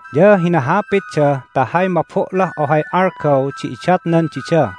Ya hinahapitda ta hay mabo'lah ohay algaw di idatnan dida,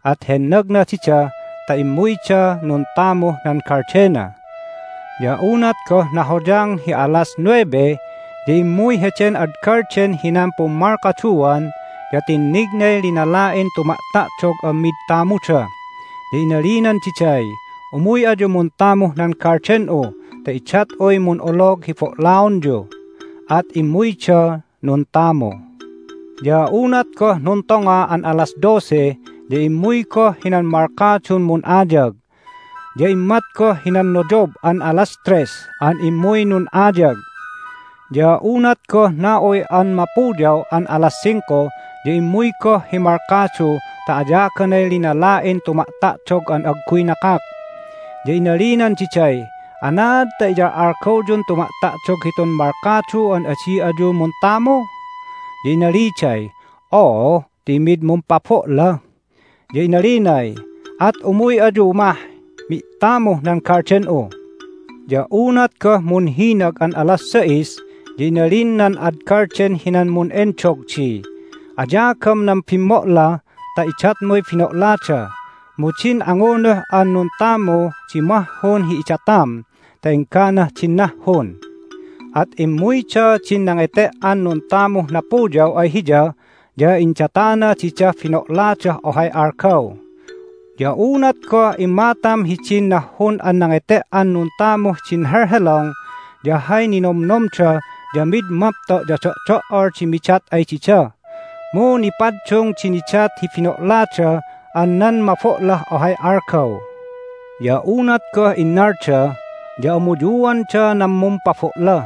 at hennagna dida ta immuyda nuntamuh nan galdena. Ya unat goh nahoyang hi alas nuebe ya immuy heden ad galden hinan pummalkaduan, ya tinnignay linala'in tuma'ta'dog an mid tamuda. Ya inalinan diday, Umuy ayu muntamuh nan galden'u ta idat'uy mun'olog hi bo'laonyu. At immuyda nuntamu. Ya unat goh nuntonga an alas dose ya immuy goh hinan malkadun mun'ayag, ya immat goh hinan noyob an alas tres an immuy nun'ayag. Ya unat goh na'uy an mapuyaw an alas singko ya immuy goh hi malkadu ta ayaganay linala'in tuma'ta'dog an agguy nakak. Ya inalinan diday, Anaad ta iyal'algawyun tuma'ta'dog hitun malkadu an adi ayu muntamu? Ya inaliday, Oo, ti mid mumpabo'la. Ya inalinay, At umuy ayu mah mi'tamuh nan galden'u. Ya unat goh munhinag an alas sais ya inalin nan ad galden hinan mun'endog di, Ayagam nan bimmo'la ta idatmuy bino'lada, mu din angunuh an nuntamu di mahhun hi idatam ta engganah din nahhun. At immuyda din nangete"an nuntamuh napuyaw ay hiya, ya indatana didah bino'ladah ohay algaw. Ya unat goh immatam hidin nahhun an nangete"an nuntamuh din helhelong ya hay ninomnomda ya mid mapto' ya do'do"ol di midat ay dida. Mu nipaddung di nidat hi bino'lada an nan mabo'lah ohay algaw. Ya unat goh innalda ya amuyuanda nan mumpabo'la,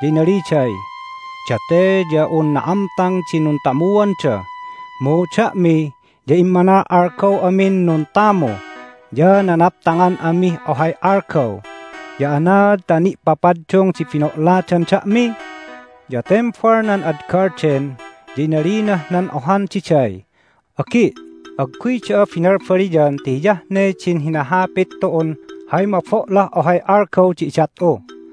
ya inaliday, Date ya un na'amtang di nuntamuanda, mu da'mi ya immanal'algaw amin nuntamu, ya nanaptangan amih ohay algaw, ya anaad ta ni'papaddung di bino'ladan da'mi? Ya tembal nan ad galden, ya inalinah nan ohan diday, Agi', agguy da'a binalbaliyan ti hiyah ne din hinahapit tu'un hay mabo'lah ohay algaw di idat'u.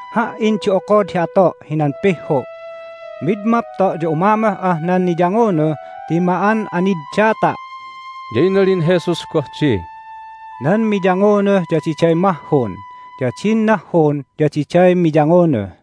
Ha"in di okod hi ato' hinan pihhu'. Mid mapto' ya umamoh'ah nan niyangunuh ti ma'an'aniddata'!" Ya inalin Jesus goh di, "Nan miyangunuh ya diday mahhun, ya din nahhun ya diday miyangunuh."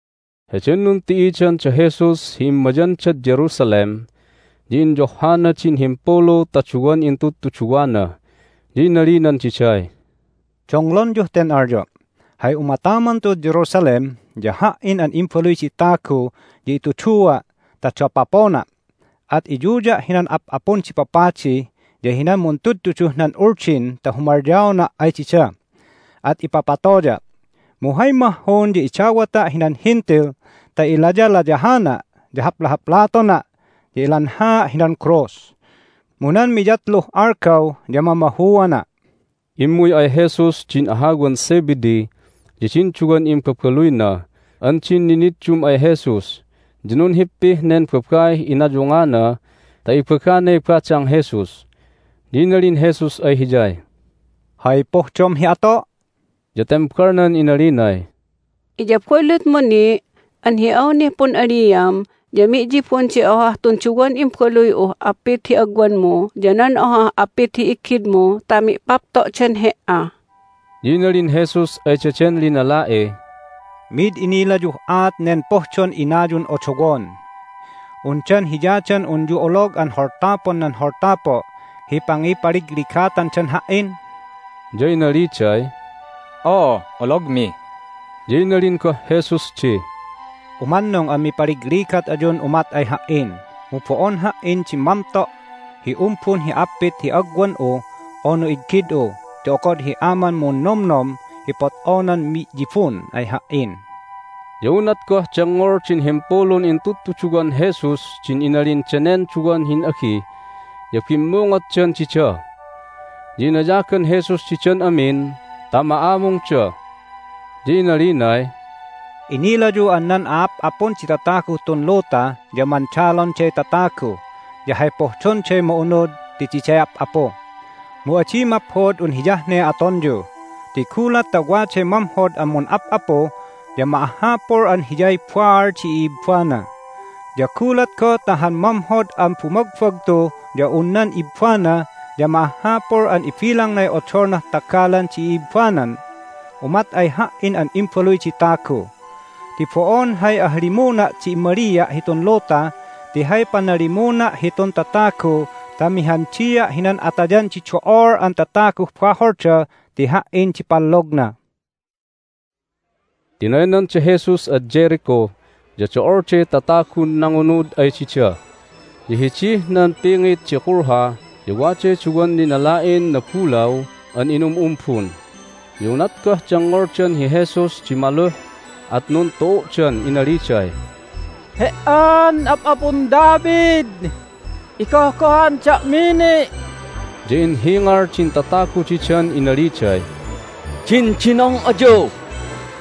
Heden nunti'idan da Jesus hi immayandad Jerusalem ya inyohhana din himpulu ta duwan intudtuduwana, ya inalinan diday, "Donglonyuh ten alyo': Hay umataman tu'ud Jerusalem ya Ha"in an Imbaluy di Tagu ya itudua' ta dapopona', at iyuya' hinan a'ap'apun di papadi ya hinan muntudtuduh nan Uldin ta humalyaona' ay dida, at ipapatoya'. Mu hay mahhun ya idawata' hinan Hentil ta ilayalayahana', ya haplahaplatona', ya ilanhaa' hinan krus. Mu nan miyatluh algaw ya mamahuana'." Immuy ay Jesus din ahawan Zebedee ya din duwan imbabaluyna an din niniddum ay Jesus, ya nunhippih nen babaih inayungana ta ibaganay badang Jesus. Ya inalin Jesus ay hiyay, "Hay pohdom hi ato'?" Ya tembalnan inalinay, "Iyabulutmu ni' an hi awnih pun'aliam ya mi'yibun di ohah tun duwan imbaluy'uh appit hi agwanmu, ya nan ohah appit hi iggidmu ta mi'papto'dan He"a." Ya inalin Jesus ay daden linala'iy, "Mid inilayuh aat nen pohdon inayun odowon. Undan hiya dan unyu olog an holtapon nan holtapo' hi pangipaligligatandan Ha"in?" Ya inaliday, "Oo, ologmi." Ya inalin goh Jesus di, "Umannung an mipaligligat ayun umat ay Ha"in! Mu bo'on Ha"in di mamto' hi umbun hi appit hi agwan'u unu iggid'u ti okod hi Aman munnomnom hi pot'onan mi'yibun ay Ha"in." Ya unat goh dengngol din himpulun intudtuduwan Jesus din inalin danen duwan hin'agi ya bimmungotdan dida. Ya inayagan Jesus didan amin ta ma'amungda, ya inalinay, "Inilayu an nan a'ap'apun di tataguh tun luta ya mandalonday tatagu, ya hay pohdonday ma'unud ti diday ap'apu. Mu adi maphod un hiyah ne atonyu! Ti gulat ta waday mamhod an mun'ap'apu ya ma'ahhapul an hiyay baal di i'ibbana. Ya gulat goh ta han mamhod an bumagbagtu ya un nan ibbana ya ma'ahhapul an ibilangnay odolnah tagalan di i'ibbanan umat ay Ha"in an Imbaluy di Tagu. Ti bo'on hay ahalimuna' di immalia' hitun luta ti hay panalimuna' hitun tatagu ta mihandia' hinan atayan di do'ol an tataguh baholda ti Ha"in di pallogna." Tinaynan da Jesus ad Jericho, ya do'olday tatagun nangunud ay dida. Ya hidih nan pingit di kulha ya waday duwan linala'in nabulaw an inum'umbun. Ya unat goh dengngoldan hi Jesus di maluh at nuntu'u'dan inaliday, "He"an Ap'apun David, igohgohan da'mi ni'!" Ya inhingal din tatagu didan inaliday, "Dindinong ayu!"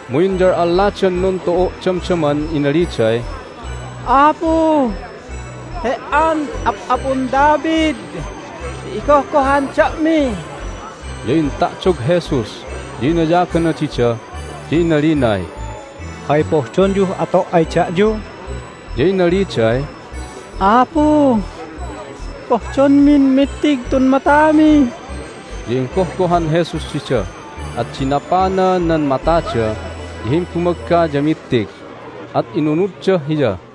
Mu inyal'alladan nuntu'u' damdaman inaliday, "Apu, He"an Ap'apun David ya igohgohan da'mi!" Ya inta'dog Jesus, ya inayagana dida, ya inalinay, "Hay pohdonyuh ato' ay da'yu?" Ya inaliday, "Apu, pohdonmin mittig tun matami!" Ya inggohgohan Jesus dida, at dinapana nan matada, ya himbumagga ya mittig, at inunudda Hiya.